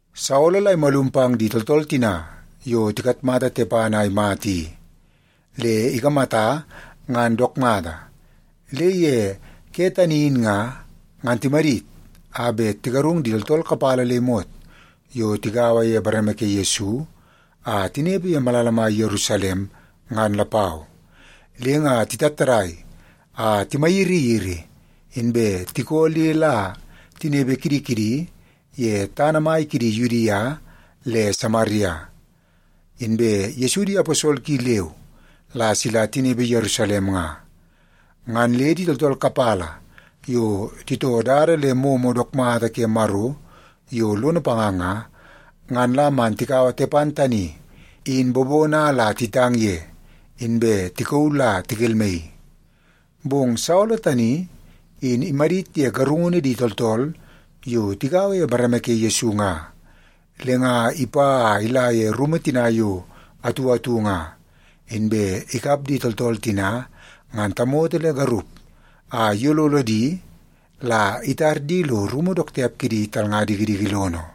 Saolo la imalum pang di tooltool tina yo tikatmata Tepan a imata i, le ikamata ngan dook mata. Le ye ke tani in nga, ngan timadit a bet tigarung di tooltool kapala le imot yo tigaua ye bareme ke Yesu a tinepe ye malala mai Yerusalem, ngan lapau. Le nga titattadai a timayiriyiri, inbe tikoo le la tinepe kidi kidi ye tana mai kidi Yudia le Samaria. Inbe Yesu di aposol ki leu la sila tinepe Yerusalem nga. Ngan le di tooltool kapala yo titoo dada le momo dook mata ke Maro yo lono panga nga, ngan la man tikaua Tepan tani in bobono a la titang ye, inbe tikauu la tikelmaii. Bong Saolo tani in imadit ye garungunu di tooltool yo tigaua ye bareme ke Yesu nga. Le nga ipa a ila ye rumu tina yo atu atu nga, inbe ikap di tooltool tina ngan tamoto le garup, a iyololo di la itar di lo rumu dook tiap kidi talnga dikidiki lono.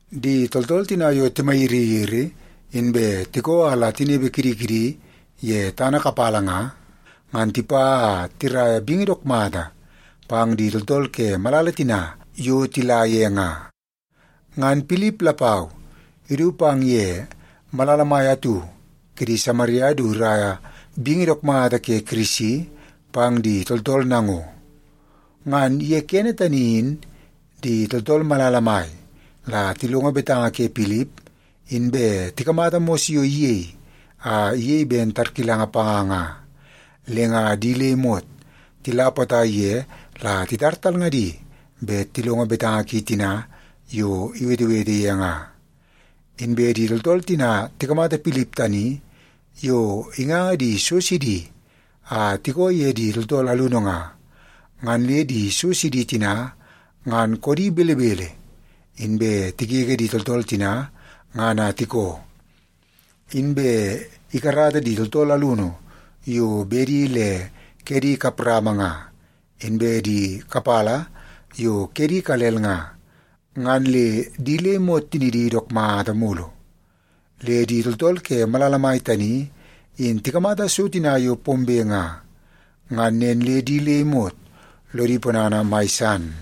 Di tooltool tina yo timayiriyiri inbe tikoo a la tinepe kidi kidi ye tana kapala nga, ngan tipa a tiraia bingi dook mata pang di tooltool ke malala tina yo tila ye nga. Ngan Pilip lapau idu pang ye malala mai atu kidi Samaria du iraia bingi dook mata ke Kirisi pang di tooltool nango. Ngan ye kene tani in, di tooltool malala mai la tilongo betanga ke Pilip, inbe tikamata mos yo iyei a iyei ben tarkilanga panga nga, le nga di le imot tila potai ye la titar talngadi bet tilongo betanga ki tina yo iwetewete ye nga. Inbe di tooltool tina tikamata Pilip tani yo inganga di so sidi a tikoo ye di tooltool alunu nga, ngan le di so sidi tina ngan koodi belebele, inbe tigege di tooltool tina ngan a tikoo. Inbe ikarata di tooltool alunu yo bedi le kedi kap rama nga, inbe di kapala yo kedi ikalel nga, ngan le di le imot tinidi dook mata mulu. Le di tooltool ke malala mai tani in tikamata so tina yo pombe nga, ngan nen le di le imot lodi ponana mai san.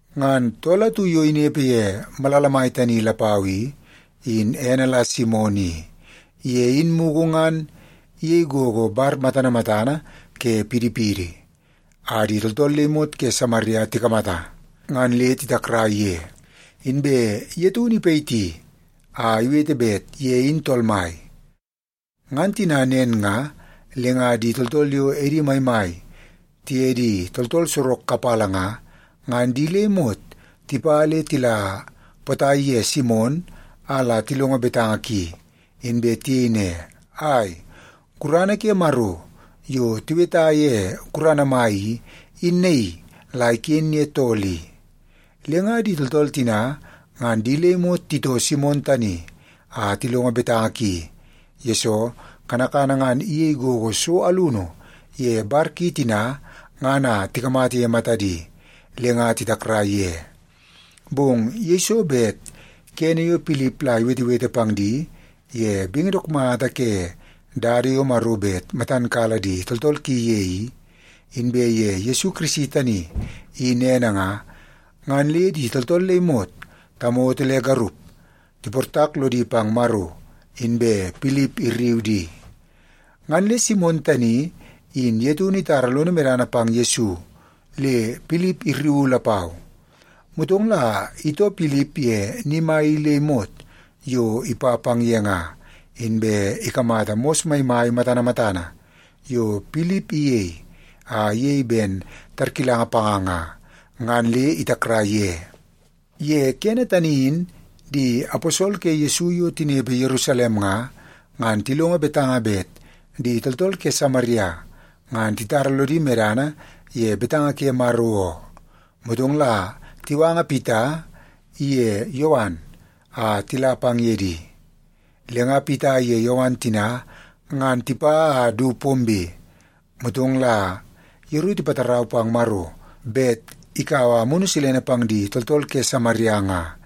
Ngan tool atu yo inepe ye malala mai tani lapau i, in ene la Simon i. Ye in mugu ngan iyei gogo bar matana matana ke pidipidi, a di tooltool le imot ke Samaria tikamata, ngan le titakrai ye. Inbe ye taunu ipayiti a iwete bet ye in tool mai. Ngan tina nen nga, le nga di tooltool yo edi maimai tiye di tooltool sorok kapala nga, ngan di le imot tipa le tila potai ye Simon a la tilongo betanga ki. Inbe tiyei ne, “Ai, gurana ke Maro yo tiweta ye Gurana Mai i, in naii la iken ye tool i.” Le nga di tooltool tina ngan di le imot titoo Simon tani a tilongo betanga ki, yesoo kanakana ngan iyei gogo so alunu ye bar ki tina ngan a tikamata ye matadi le nga titakrai ye. Bong yeiso bet kene yo Pilip la iwetewete pang di ye bingi dook mata ke dada yo Maro bet matan kala di tooltool ki ye i, inbe ye Yesu Kirisi tani in ene nga, ngan le di tooltool le imot, tamoto le garup, tiportak lodi pang Maro, inbe Pilip irriu di. Ngan le Simon tani in ye taunu itara lono medana pang Yesu, le Pilip irriu lapau. Motong la itoo Pilip ye ni mai i le imot yo ipa pang ye nga, inbe ikamata mos maimai matana matana yo Pilip iyei a iyei ben tarkilanga panga nga, ngan le itakrai ye. Ye kene tani in di aposol ke Yesu yo tinepe Yerusalem nga, ngan tilongo betanga bet di tooltool ke Samaria ngan titara lodi medana ye betanga ke Maro oo. Motong la tiwanga Pita iye Yowan a tila pang ye di. Le nga Pita iye Yowan tina ngan tipa a du pombe, motong la yeru tipatarau pang Maro bet ikaua Amunu Silene pang di tooltool ke Samaria nga,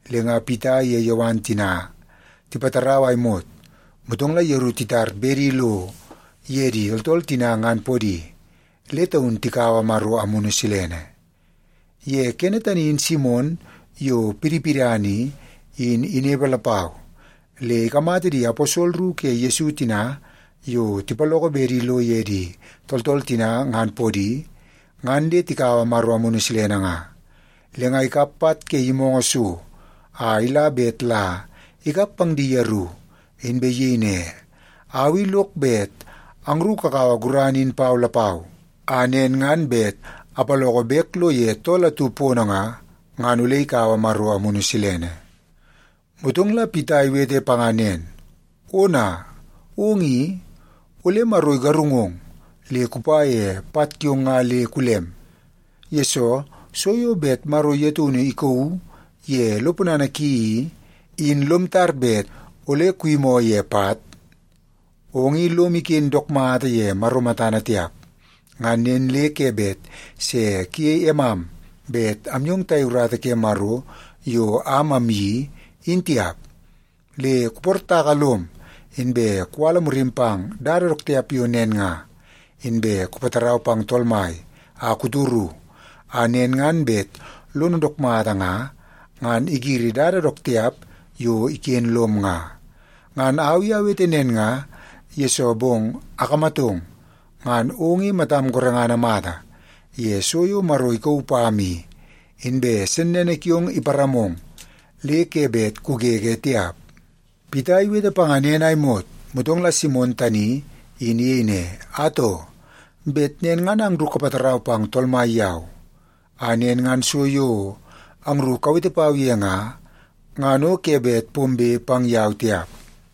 Le nga Pita iye Yowan tina tipatarau a imot, motong la yeru titar bedi lo ye di tooltool tina ngan podi, le taun tikaua Maro Amunu Silene. Ye kene tani in Simon, yo pidipidana i, in inepe lapau, le ikamata di aposol ru ke Yesu tina yo tipaloko bedi lo ye di tooltool tina ngan podi, ngan le tikaua Maro Amunu Silene nga. Le nga ikap pat ke yimoongoo so a ila bet la ikap pang di yeru, inbe iyei ne, “Au i lok bet angru kakaua gurana in pau lapau, a nen ngan bet apaloko bek lo ye tool atu pono nga, ngan ole ikaua Maro Amunu Silene.” Motong la Pita iwete panga nen, “Ona, ong i, ole Maro igarungong le kupa ye pat kiong nga le kulem, yesoo so yo bet Maro ye taunu ikauu ye lo ponana ki i, in lom tar bet ole kuyimoo ye pat. Ong i lom iken dook mata ye Maro matana tiap. Ngan nen le ke bet se kuyei emam bet amyong tayei urata ke Maro yo am amyeii, in tiap. Le kuportaka lom, inbe kuwala murim pang dada dook tiap yo nen nga. Inbe kupatarau pang Tool Mai a kutoru, a nen ngan bet lono dook mata nga, ngan igiri dada dook tiap yo iken lom nga. Ngan au i awete nen nga, yesoo bong akamatong, ngan ong i matam gorengana mata ye so yo Maro ikauu pam i, inbe sennene kiong iparamong le ke bet kugege tiap.” Pita iwete panga nen a imot, motong la Simon tani in iyei ne, “Atoo, bet nen ngan angru kapatarau pang Tool Mai yau, a nen ngan so yo angru kawete pau ye nga, ngan o ke bet pombe pang yau tiap.”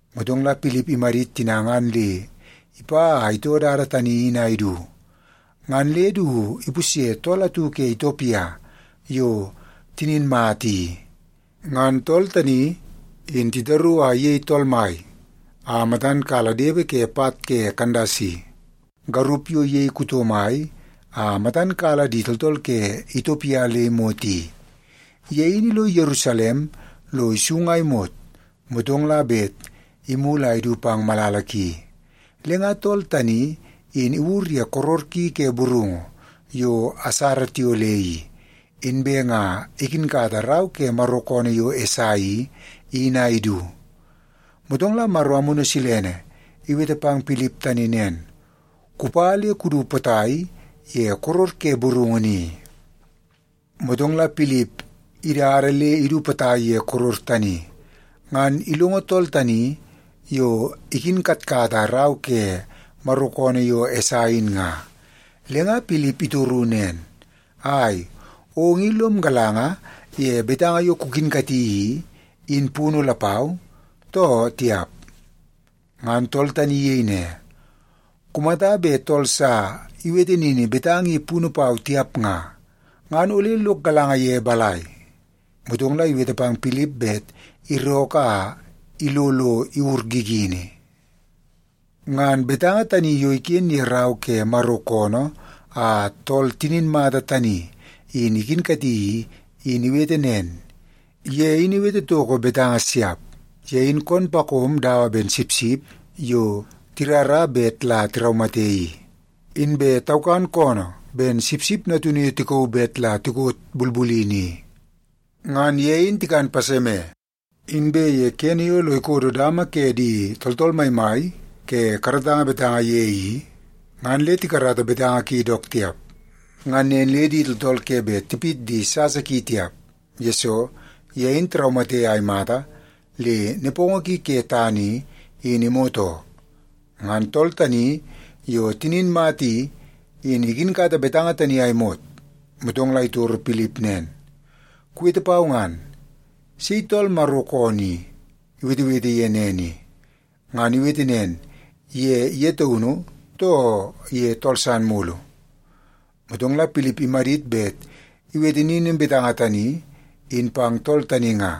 Motong la Pilip imadit tina ngan le ipa a itoo dada tani in a idu, ngan le du ipusye tool atu ke Itiopia yo tinin mata i. Ngan tool tani in titaru a iyei tool mai a matan kala depe ke pat ke Kandasi, garup yo iyei kuto mai a matan kala di tooltool ke Itiopia le imot i. Ye in ilo Yerusalem lo isung a imot, motong la bet imulu a idu pang malala ki. Le nga tool tani in iwur ye koror ki ke burungu yo asara tiyole i, inbe nga ikinkata rau ke Maro koonoo yo Esai i, in a idu. Motong la Maro Amunu Silene iwete pang Pilip tani nen, “Kupa le kudu potai ye koror ke burungu ni.” Motong la Pilip idada le idu potai ye koror tani, ngan ilongo tool tani yo ikinkatkata rau ke Maro koonoo yo Esai in nga. Le nga Pilip itoru nen, “Ai, ong i lom galanga ye betanga yo kukinkati i, in punu lapau, too tiap?” Ngan tool tani iyei ne, “Kumata bet tool sa iwete nini betanga i punu pau tiap nga, ngan ole lok galanga ye balai?” Motong la iwete pang Pilip bet irookoo a ilo lo iwur gigini. Ngan betanga tani yo iken ye rau ke Maro koonoo a tool tinin mata tani in ikinkati i, in iwete nen: “Ye in iwete toko betanga siap. Ye in koom pakom dawa ben sipsip yo tirara bet la tiraumate i, inbe taukan koonoo ben sipsip natunu yo tikauu bet la tikot bulbulini i. Ngan ye in tikan paseme, inbe ye kene yo lo ikodo dama ke di tooltool maimai ke karatanga betanga ye i, ngan le tikarata betanga ki dook tiap. Ngan nen le di tooltool ke bet tipit di sasa ki tiap, yesoo ye in tiraumate a imata le nepongo ki ke tana i, in imot oo.” Ngan tool tani yo tinin mata i, in ikinkata betanga tani a imot, motong la itoro Pilip nen, “Kuwete pau ngan, sei tool Maro koonoo i iwetewete ye nen i? Ngan iwete nen ye ye taunu, too ye tool san mulu?” Motong la Pilip imadit bet iwete nini betanga tani in pang tool tani nga,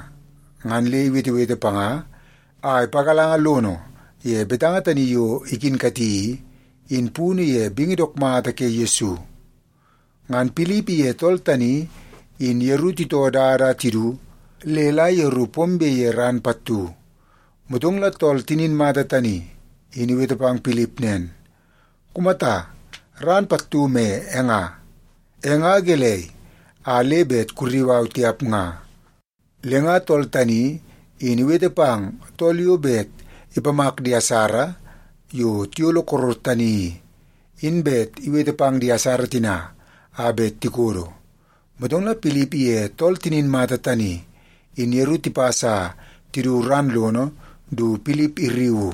ngan le iwetewete panga a ipagalanga lono ye betanga tani yo ikinkati i, in punu ye bingi dook mata ke Yesu. Ngan Pilip iye tool tani in yeru titoo dada a tidu le la yeru pombe ye ran pattu. Motong la tool tinin mata tani in iwete pang Pilip nen, “Kumata, ran pattu me e nga. E nga gelei a le bet kurriu au tiap nga?” Le nga tool tani in iwete pang tool yo bet ipamak di asara yo tiyolo koror tani i, in bet iwete pang di asara tina a bet tikodo. Motong la Pilip ye tool tinin mata tani in yeru tipas a tidu ran lono du Pilip irriuu.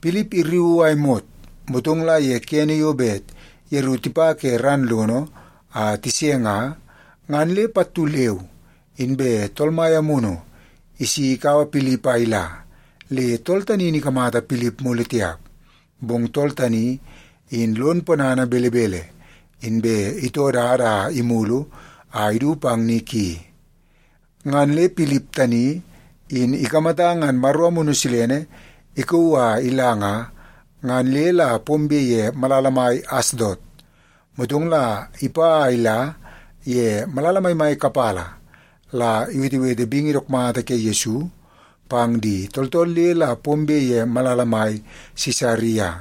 Pilip irriuu a imot, motong la ye kene yo bet yeru tipa ke ran lono a tise nga, ngan le pattu leu inbe Tool Mai Amunu isi ikaua Pilip a ila, le tool tani in ikamata Pilip mulu tiap. Bong tool tani, in lon ponana belebele, inbe itoo dada a imulu a idu pang ni ki. Ngan le Pilip tani in ikamata ngan Maro Amunu Silene ikauu a ila nga, ngan le la pombe ye malala mai Asdot. Motong la ipa a ila ye malala maimai kapala la iwetewete bingi dook mata ke Yesu pang di tooltool le la pombe ye malala mai Sisaria.